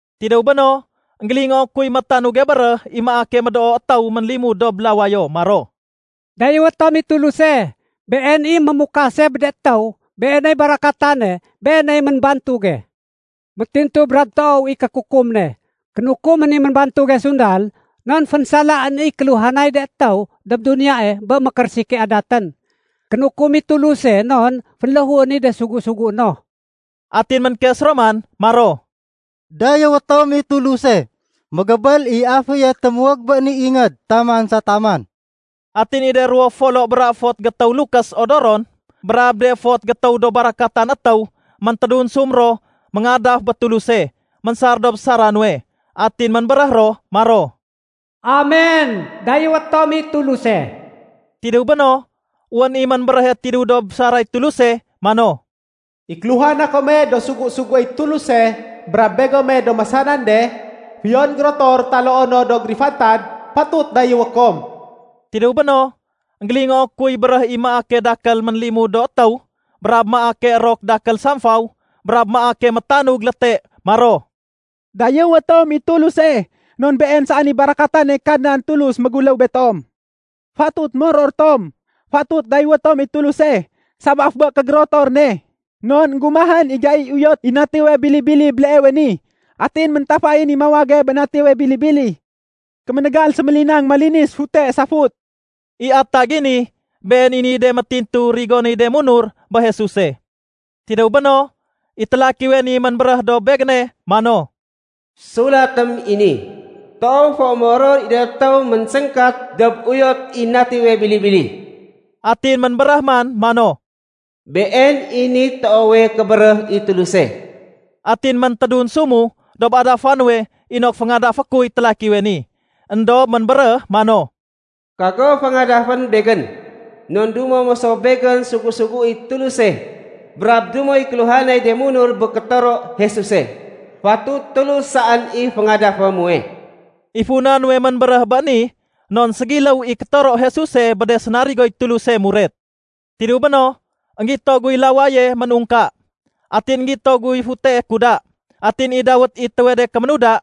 Tidéw béno, énggélingoo kuy métanuge béréh i maake médoo étéw ménlimud dob lawayo maro, “Dayéwé tom i Tuluse! Been i mémukase bé de étéw, Beeney barakatane, Beeney ménbantuge. Métintu brab toow i kékukum ne. Kénukumén i ménbantuge sundal non fénsalaén i kéluhanay de étéw dob duniyae bé mékérésike adatén. Kénukum i Tuluse non fénléhuén i de sugu-sugué no.” Atin ménkes ro man maro, “Dayéwé tom i Tuluse! Mégébél i aféye témuwég bé ni ingéd taman sa taman.” Atin i de ruwo folo bra fot gétéw lukés odoron brab de fot gétéw do barakatan étéw méntédunsum ro méngadaf bé Tuluse ménsar dob sara nuwe. Atin ménbéréh ro maro, “Amen! Dayéwé tom i Tuluse.” Tidéw béno, wén i ménbéréhe tidéw dob saray Tuluse mano, “I kéluhana kome do sugu-suguéy Tuluse brab begome do masanan de, fiyon gérotor taloo no do gérifantad, fatut dayéwé kom.” Tidéw béno, énggélingoo kuy béréh i maake dakél ménlimud do étéw brab maake érok dakél samfaw brab maake métanug léte maro, “Dayéwé tom i Tuluse non Been saén i barakatane Kadnan Tulus méguléw betom. Fatut moror tom. Fatut dayéwé tom i Tuluse sabaf bé kégérotor ne. Non énggumahén i gaiy uyot i Natiwe Bili-bili béleewe ni. Atin méntafayén i mawage bé Natiwe ni Bili-bili. Kéménégal sémélinang malinis fute safut.” I atag i ni, been i niy de métintu rigonéy de munur bé Jesuse. Tidéw béno, i télakiwe ni ménbéréh dob begéne mano, “Sulatém i ni: Toow fo moror i de étéw ménséngkat dob uyot i Natiwe Bili-bili.” Atin ménbéréh man mano, “Been i niy toowe kébéréh i Tuluse.” Atin méntédunsumu dob adafa nuwe inok féngadafé kuy télakiwe ni. Endob ménbéréh mano, “Kago féngadafén begén. Non dumo mo so begén sugu-suguéy Tuluse brab dumoy kéluhanay de munur bé kétoro Jesuse. Fatut Tulus saén i féngadafé muwe.” I funa nuwe ménbéréh bé ni non ségiléw i kétoro Jesuse bé de sénarigoy Tuluse muret. Tidéw béno, énggito guy lawaye ménungka. Atin énggito guy futee kuda. Atin i dawét i étéwe de kéménuda,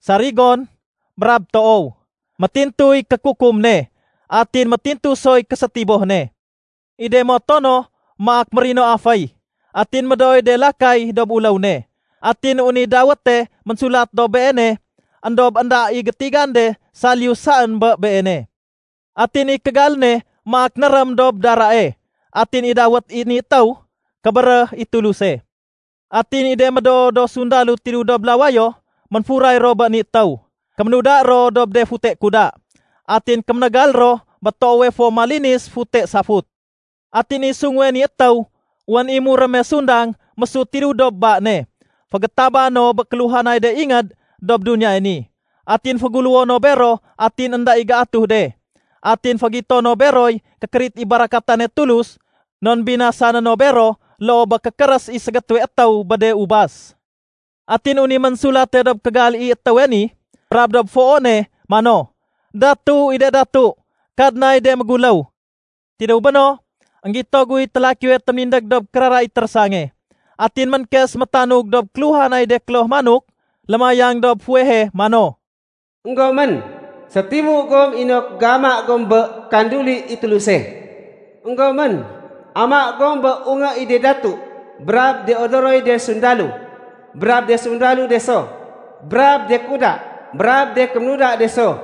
“Sarigon” brab “Toow”. Métintuy kékukum ne, atin métintu soy késétiboh ne. I de moto no maak mérino aféy, atin médooy de lakay dob uléw ne. Atin wén i dawéte ménsulat dob Beene, éndob énda i gétigan de saliyu saén bé Beene. Atin i kégal ne maak nérém dob darae. Atin i dawét i ni étéw, “Kébéréh i Tuluse.” Atin i de médoo do sundalo tidéw dob lawayo ménfuray ro bé ni étéw. Kéménuda ro dob de fute kuda, atin kéménégal ro bé toowe fo malinis fute safut. Atin i sunguwe ni étéw, wén i muréme sundang mésut tidéw dob ba ne fégétaba no bé kéluhanay de ingéd dob duniyae ni. Atin féguléwo no bero atin énda i géatuh de. Atin fégito no beroy kékérit i barakatane Tulus non binasané no bero loo bé kékérés i ségétéwe étéw bé de ubas. Atin wén i ménsulate dob kégal i étéwe ni brab dob foo ne mano, “Datu i de datu, Kadnay de méguléw.” Tidéw béno, énggito guy télakiwe téménindég dob kérara i térésange. Atin ménkes métanug dob kéluhanay de kloh manok lémayang dob fuwehe mano, “Enggomén. Sétimu gom inok géama gom bé kanduli i Tuluse. Enggomén, ama gom bé ungé i de datu, brab de odoroy de sundalo, brab de sundalo de so, brab de kuda, brab de kéménuda de so,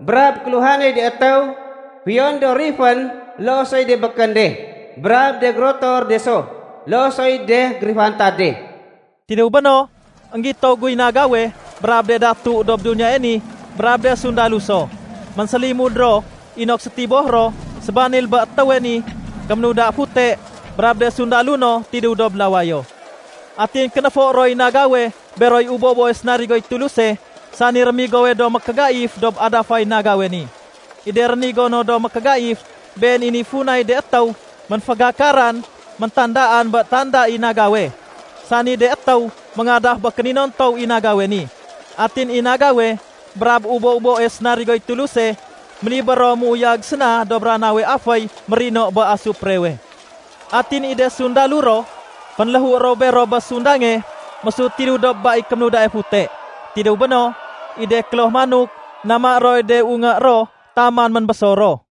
brab kéluhanay de étéw fiyon do rifén loo soy de békén de, brab de gérotor de so, loo soy de gérifantad de.” Tidéw béno, énggito guy nagawe brab de datu dob duniyae ni brab de sundalo so. Ménsélimud ro inok sétiboh ro sébanil bé étéwe ni kéménuda fute brab de sundalo no tidéw dob lawayo. Atin kénéfo roy nagawe beroy ubo-uboe sénarigoy Tuluse, sani rémigowe do mékégaif dob adafay nagawe ni. I de rénigo no do mékégaif, been i niy funay de étéw ménfégakaran méntandaan bé tanda i nagawe, sani de étéw méngadaf bé kéninontow i nagawe ni. Atin i nagawe brab ubo-uboe sénarigoy Tuluse, ménibér ro méuyag séna dob ranawe aféy mérino bé asuprewe. Atin i de sundalo ro, fénléhu ro bero bé sundange mésut tidéw dob ba i kéménudae fute. Tidéw béno, i de kloh manok, nama roy de ungé ro taman ménbésor ro.